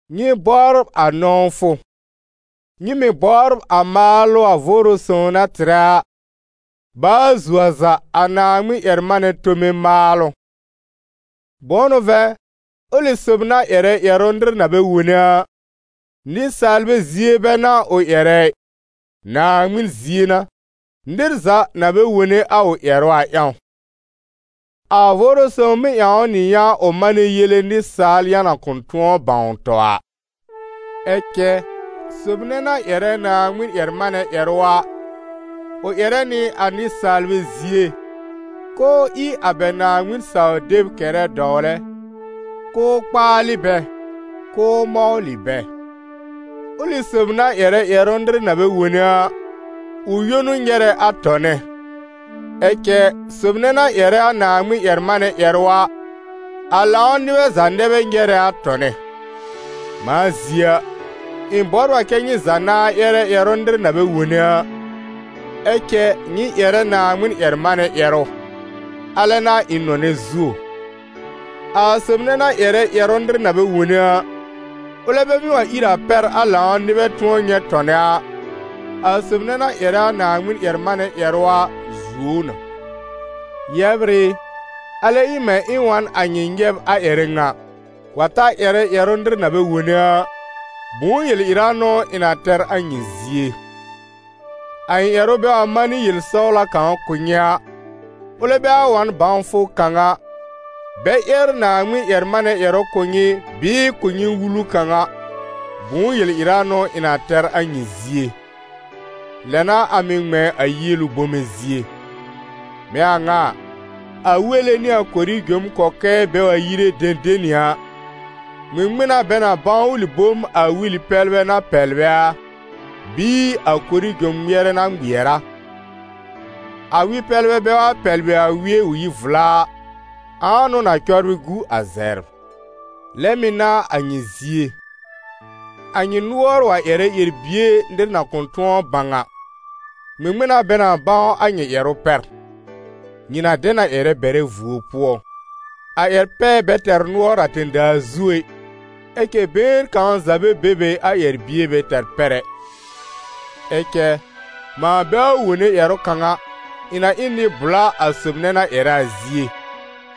Nyɩ bɔbr a nɔ̃wfʋ. Nyɩ mɩ̀ bɔbr a maalʋ a Vʋʋrʋ Sõw na tɩrɛ a, baa zuo a za a Naaŋmɩn-ƴɛr-manɛ tome maalʋ. Bʋ̃ʋ n'ʋ vɛ̃ ʋlɩ sob na ƴɛrɛ ƴɛrʋ nɩr na bɛ wone a, nɩsaalbɛ zie bɛ n'a ʋ ƴɛrɛ ɩ, Naaŋmɩn zie n'a, nɩr za na bɛ wone a ʋ ƴɛrʋ a ƴãw. A Vʋʋrʋ Sõw mɩ́ ƴãw ʋ nɩ yã ʋ manɛ yele nɩsaal yã na kʋ̃ tʋ̃ɔ bãw tɔ a. Ɛ cɛ sob nɛ na ƴɛrɛ Naaŋmɩn-ƴɛr-manɛ ƴɛrʋ a, ʋ ƴɛrɛ nɩ a nɩsaalbɛ zie, k'ʋʋ ɩ a bɛ Naaŋmɩn-saw-deb kɛrɛ dɔwlɛ, k'ʋʋ kpaalɩ bɛ, k'ʋʋ mɔwlɩ bɛ. Ʋlɩ sob na ƴɛrɛ ƴɛrʋ nɩr na bɛ wone a, ʋ yõ n'ʋ nyɛrɛ a tɔnɛ, ɛ cɛ sob nɛ na ƴɛrɛ a Naaŋmɩn-ƴɛr-manɛ ƴɛrʋ a, a lãw nɩbɛ za nɛ bɛ nyɛrɛ a tɔnɛ. Mãa zie a, ɩ̃ bɔbr a kɛ́ nyɩ za nãá ƴɛrɛ ƴɛrʋ nɩr na bɛ wone a, ɛ cɛ nyɩ ƴɛrɛ Naaŋmɩn-ƴɛr-manɛ ƴɛrʋ, alɛ n'a ɩ̃ nɔnɛ zuo. A sob nɛ na ƴɛrɛ ƴɛrʋ nɩr na bɛ wone a, ʋlɛ bɛ mɩ́ wa ír a pɛr a lãw nɩbɛ tʋ̃ɔ nyɛ̃ tɔnɛ a, a sob nɛ na ƴɛrɛ a Naaŋmɩn-ƴɛr-manɛ ƴɛrʋ a zuo ʋ na. Yɛbr ɩ, alɛ ɩ mɛ̃ ɩ̃ wa n a nyɩ nyɛb a ƴɛrɛ ŋa, wa ta ƴɛrɛ ƴɛrʋ nɩr na bɛ wone a, bʋ̃ʋ yel-ɩra n'ʋ ɩ̃ na tɛr a nyɩ zie? A ɩ̃ ƴɛrʋ bɛ wa manɩ yel-sɔwla kãw kʋ̀ nyɩ a, ʋlɛ bɛ wa wa n bãwfʋ kãw a, bɛ ƴɛr Naaŋmɩn-ƴɛr-manɛ ƴɛrʋ kʋ̀ nyɩ bɩɩ kʋ̀ nyɩ wulu kãw a, bʋ̃ʋ yel-ɩra n'ʋ ɩ̃ na tɛr a nyɩ zie? Lɛ n'a a mɩ̀ ŋmɛ̃ a yielu bome zie. Mɛ̃ a ŋa a, a wele nɩ a korijom kɔkɛɛ bɛ wa yire dẽdẽni a, ŋmɩŋmɩn n'a bɛ na bãw ʋlɩ bom a weli-pɛblɛ na pɛblɛ a, bɩɩ a korijom ŋmɩɛrɛ na ŋmɩɛr a? A wɩ-pɛblɛ bɛ wa pɛblɩ a wɩɛ ʋ yi vla a, ãa n'ʋ na cɔbrɩ gu a zɛbr? Lɛ mɩ̀ n'a a nyɩ zie. A nyɩ nʋɔr wa ƴɛrɛ ƴɛr-bie nɩr na kʋ̃ tʋ̃ɔ bãw a, ŋmɩŋmɩn n'a bɛ na bãw a nyɩ ƴɛrʋ pɛr? Nyɩ na dɛ na ƴɛrɛ bɛrɛ vuo pʋɔ. A ƴɛr-pɛɛ bɛ tɛr nʋɔr a tẽ-daa zu ɛ, ɛ cɛ been kãw za bɛ be be a ƴɛr-bie bɛ tɛr pɛr ɛ. Ɛ cɛ mãa bɛ wa wone ƴɛrʋ kãw a, ɩ̃ na ɩ n nɩ-bʋla a sob nɛ na ƴɛrɛ a zie,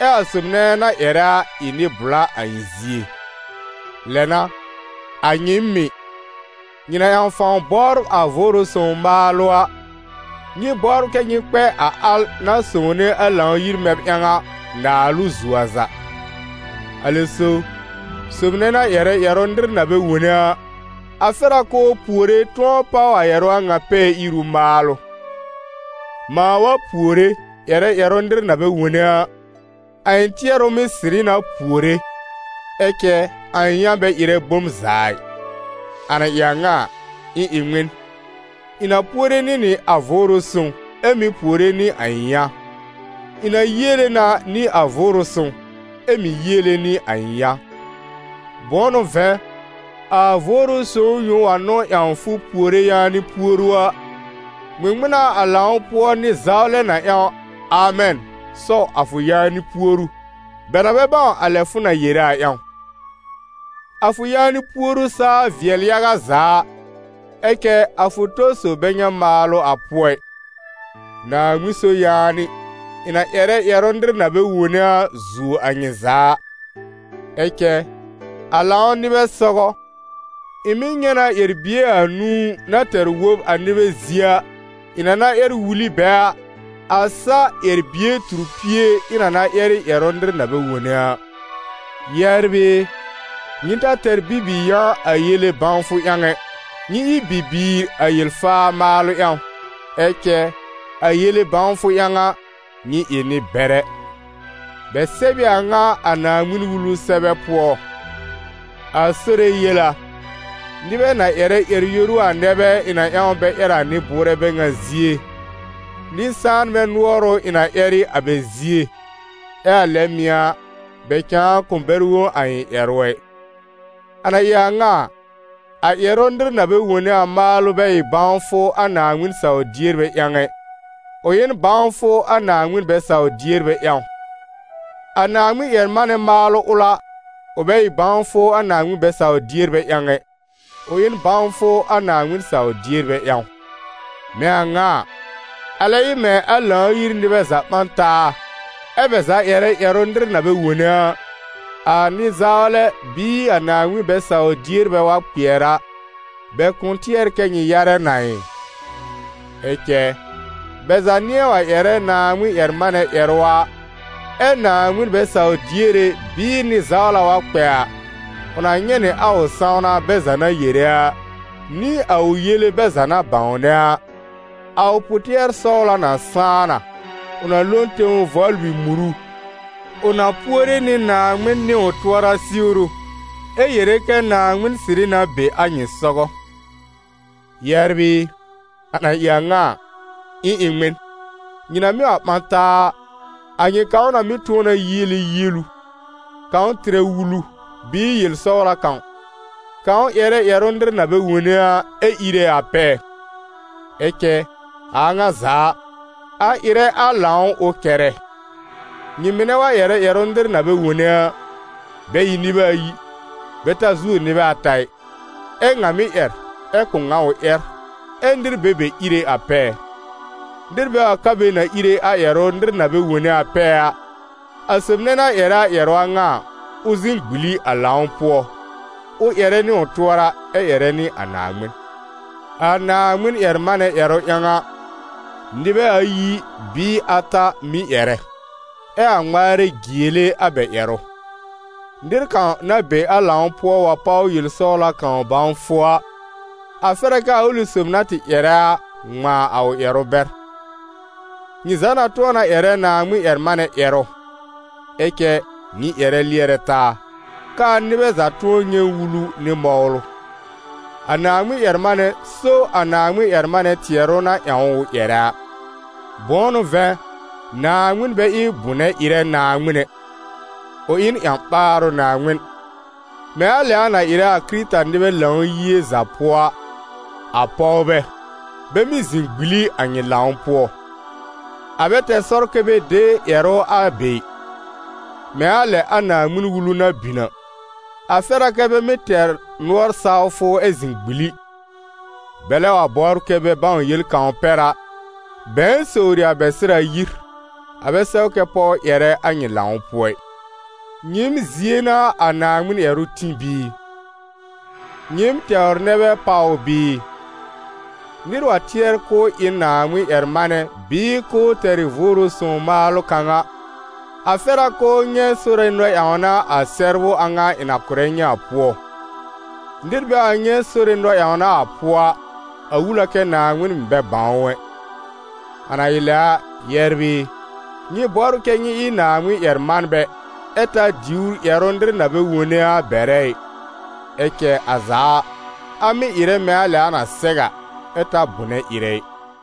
ɛ a sob nɛ na ƴɛrɛ a, ɩ nɩ-bʋla a ɩ̃ zie. Lɛ n'a, a nyɩɩm mɩ̀, nyɩ na ƴãw fãw bɔbr a Vʋʋrʋ Sõw maalʋ a, nyɩ bɔbr kɛ nyɩ kpɛ a al na sõwne a Lãw-yir mɛb ƴãw a, naalʋ zuo a za. Alɛ so, sob nɛ na ƴɛrɛ ƴɛrʋ nɩr na bɛ wone a, a fɛr a k'ʋʋ puore tʋ̃ɔ páw a ƴɛrʋ a ŋa pɛɛ-iru maalʋ. Mãa wa puore ƴɛrɛ ƴɛrʋ nɩr na bɛ wone a, a ɩ̃ tɩɛrʋ mɩ́ sɩrɩ na puore, ɛ cɛ a ɩ̃ yã bɛ ɩrɛ bom za ɩ. A na ɩ a ŋa a, ɩ̃ ɩ ŋmɩn? Ɩ̃ na puore nɩ nɩ a Vʋʋrʋ Sõw, ɛ mɩ̀ puore nɩ a ɩ̃ yã; ɩ̃ na yiele na nɩ a Vʋʋrʋ Sõw, ɛ mɩ̀ yiele nɩ a ɩ̃ yã. Bʋ̃ʋ n'ʋ vɛ̃, a Vʋʋrʋ Sõw yõ wa n'ʋ ƴãw fʋ puore yaanɩ puoru a, ŋmɩŋmɩn n'a a lãw pʋɔ nɩ-zawlɛ na ƴãw «Amɛn» sɔw a fʋ yaanɩ puoru, bɛ na bɛ bãw a lɛ fʋ na yere a ƴãw? A fʋ yaanɩ puoru saa vɩɛl yaga za a, ɛ cɛ a fʋ tɔ sob bɛ nyɛ̃ maalʋ a pʋɔ ɩ. Naaŋmɩn so yaanɩ, ɩ̃ na ƴɛrɛ ƴɛrʋ nɩr na bɛ wone a zuo a nyɩ za a. Ɛ cɛ a lãw nɩbɛ sɔgɔ, ɩ̃ mɩ́ nyɛ̃ na ƴɛr-bie anũu na tɛr wob a nɩbɛ zie a, ɩ̃ na na ƴɛr wul ɩ bɛ a, a sa ƴɛr-bie tur pie ɩ̃ na na ƴɛr ɩ ƴɛrʋ nɩr na bɛ wone a. Yɛbr ɩ, nyɩ ta tɛr bi-bi-yã a yele bãwfʋ ƴãw ɛ; nyɩ ɩ bi-biir a yel-faa maalʋ ƴãw, ɛ cɛ a yele bãwfʋ ƴãw a, nyɩ ɩ nɩ-bɛrɛ. Bɛ sɛb ɩ a ŋa a Naaŋmɩn-Wulu sɛbɛ pʋɔ: «A Sore yel a: nɩbɛ na ƴɛrɛ ƴɛr-yoru a nɛ bɛ ɩ̃ na ƴãw bɛ ƴɛr a nɩ-bʋʋrɛ bɛ ŋa zie, nɩ-sãanbɛ nʋɔr ʋ ɩ̃ na ƴɛr ɩ a bɛ zie, ɛ a lɛ mɩ̀ a, bɛ cãa kʋ̃ bɛr wõ a ɩ̃ ƴɛrʋ ɛ.» A na ɩ a ŋa a, a ƴɛrʋ nɩr na bɛ wone a maalʋ bɛ ɩ bãwfʋ a Naaŋmɩn saw-dierbɛ ƴãw ɛ, ʋ ɩ n bãwfʋ a Naaŋmɩn bɛ-saw-dierbɛ ƴãw. A Naaŋmɩn-ƴɛr-manɛ maalʋ ʋl a, ʋ bɛ ɩ bãwfʋ a Naaŋmɩn bɛ-saw-dierbɛ ƴãw ɛ, ʋ ɩ n bãwfʋ a Naaŋmɩn saw-dierbɛ ƴãw. Mɛ̃ a ŋa a, alɛ ɩ mɛ̃ a Lãw-yir nɩbɛ za ɓã n taa, ɛ́ bɛ za ƴɛrɛ ƴɛrʋ nɩr na bɛ wone a, a nɩ-zawlɛ bɩɩ a Naaŋmɩn bɛ-saw-dierbɛ wa kpɩɛr a, bɛ kʋ̃ tɩɛr kɛ nyɩ yarɛ na ɩ? Ɛ cɛ, bɛ za nɩ̃ɛ wa ƴɛrɛ Naaŋmɩn-ƴɛr-manɛ ƴɛrʋ a, ɛ Naaŋmɩn bɛ-saw-diere bɩɩ nɩ-zawla wa kpɛ a, ʋ na nyɛ̃ nɩ a ʋ sãwna bɛ za na yere a, nɩ a ʋ yele bɛ za na bãwnɛ a. A ʋ pʋ-tɩɛr-sɔwla na sãá na; ʋ na lo n tẽw vɔblɩ muru, ʋ na puore nɩ Naaŋmɩn nɩ ʋ tʋɔra siwru ɛ yere kɛ Naaŋmɩn sɩrɩ na be a nyɩ sɔgɔ. Yɛbr ɩ, a na ɩ a ŋa a, ɩ̃ ɩ ŋmɩn? Nyɩ na mɩ́ wa ɓã taa a, a nyɩ kãw na mɩ́ tʋ̃ɔ na yiele yielu, kãw tɩrɛ wulu, bɩɩ yel-sɔwla kãw, kãw ƴɛrɛ ƴɛrʋ nɩr na bɛ wone a ɛ íre a pɛɛ; ɛ cɛ a a ŋa za a, a ɩrɛ a lãw ʋ kɛrɛ. Nyɩ mɩnɛ wa ƴɛrɛ ƴɛrʋ nɩr na bɛ wone a, bɛ ɩ nɩbɛ ayi, bɛ ta zuo nɩbɛ ata ɩ, ɛ ŋa mɩ́ ƴɛr, ɛ kʋ̀ ŋa ʋ ƴɛr, ɛ nɩr be be íre a pɛɛ. Nɩr bɛ wa ka be na íre a ƴɛrʋ nɩr na bɛ wone a pɛɛ a, a sob nɛ na ƴɛrɛ a ƴɛrʋ a ŋa a, ʋ zɩ̃ gbili a lãw pʋɔ, ʋ ƴɛrɛ nɩ ʋ tʋɔra ɛ ƴɛrɛ nɩ a Naaŋmɩn. A Naaŋmɩn-ƴɛr-manɛ ƴɛrʋ ƴãw a, nɩbɛ ayi bɩɩ ata mɩ́ ƴɛrɛ, ɛ a ŋmaarɛ jiele a bɛ ƴɛrʋ. Nɩr kãw na be a lãw pʋɔ wa páw yel-sɔwla kãw bãwfʋ a, a fɛr a k'aa ʋlɩ sob na tɩ ƴɛrɛ a, ŋmãa a ʋ ƴɛrʋ bɛr. Nyɩ za na tʋ̃ɔ na ƴɛrɛ Naaŋmɩn-ƴɛr-manɛ ƴɛrʋ, ɛ cɛ, nyɩ ƴɛrɛ lɩɛrɛ taa, k'aa nɩbɛ za tʋ̃ɔ nyɛ̃ wulu nɩ mɔwlʋ. A Naaŋmɩn-ƴɛr-manɛ so a Naaŋmɩn-ƴɛr-manɛ tɩɛrʋ na ƴãw ʋ ƴɛrɛ a. Bʋ̃ʋ n'ʋ vɛ̃, Naaŋmɩn bɛ ɩ bʋnɛ-ɩrɛ Naaŋmɩn ɛ, ʋ ɩ n ƴã-ɓaarʋ Naaŋmɩn. Mɛ̃ a lɛ a na ɩrɛ a Kɩrɩta-nɩbɛ Lãw-yie za pʋɔ a, a pɔwbɛ, bɛ mɩ́ zɩ̃ gbili a nyɩ lãw pʋɔ: a bɛ tɛr sɔr kɛ bɛ de ƴɛrʋ a be ɩ. Mɛ̃ a lɛ a Naaŋmɩn-Wulu na bin a, a fɛr a kɛ́ bɛ mɩ́ tɛr nʋɔr-sawfʋ ɛ zɩ̃ gbili. Bɛlɛ wa bɔbr kɛ bɛ bãw yel kãw pɛr a, bɛ̃ɛ sowri a bɛ sɩr a yir. A bɛ sɛw kɛ pɔw ƴɛrɛ a nyɩ lãw pʋɔ ɩ. Nyɩɩm zie n'a a Naaŋmɩn ƴɛrʋ tĩ bɩɩ? Nyɩɩm tɛwr nɛ bɛ páw ʋ bɩɩ? Nɩr wa tɩɛr k'ʋʋ ɩ n Naaŋmɩn-ƴɛr-manɛ bɩɩ k'ʋʋ tɛr ɩ Vʋʋrʋ Sõw maalʋ kãw a, a fɛr a k'ʋʋ nyɛ̃ Sore nɔ-ƴãwna a sɛbrʋ a ŋa ɩ̃ na kʋ̀rɛ nyɩ a pʋɔ. Nɩr bɛ wa nyɛ̃ Sore nɔ-ƴãwna a pʋɔ a, a wul a kɛ Naaŋmɩn mɩ̀ bɛ bãw ʋ ɛ. A na ɩ lɛ a, yɛbr ɩ, nyɩ bɔbr kɛ nyɩ ɩ Naaŋmɩn ƴɛr-manbɛ, ɛ ta diwr ƴɛrʋ nɩr na bɛ wone a bɛrɛ ɩ, ɛ cɛ a za a, a mɩ́ ɩrɛ mɛ̃ a lɛ a na sɛw a, ɛ ta bʋ̀nɛ ɩrɛ ɩ.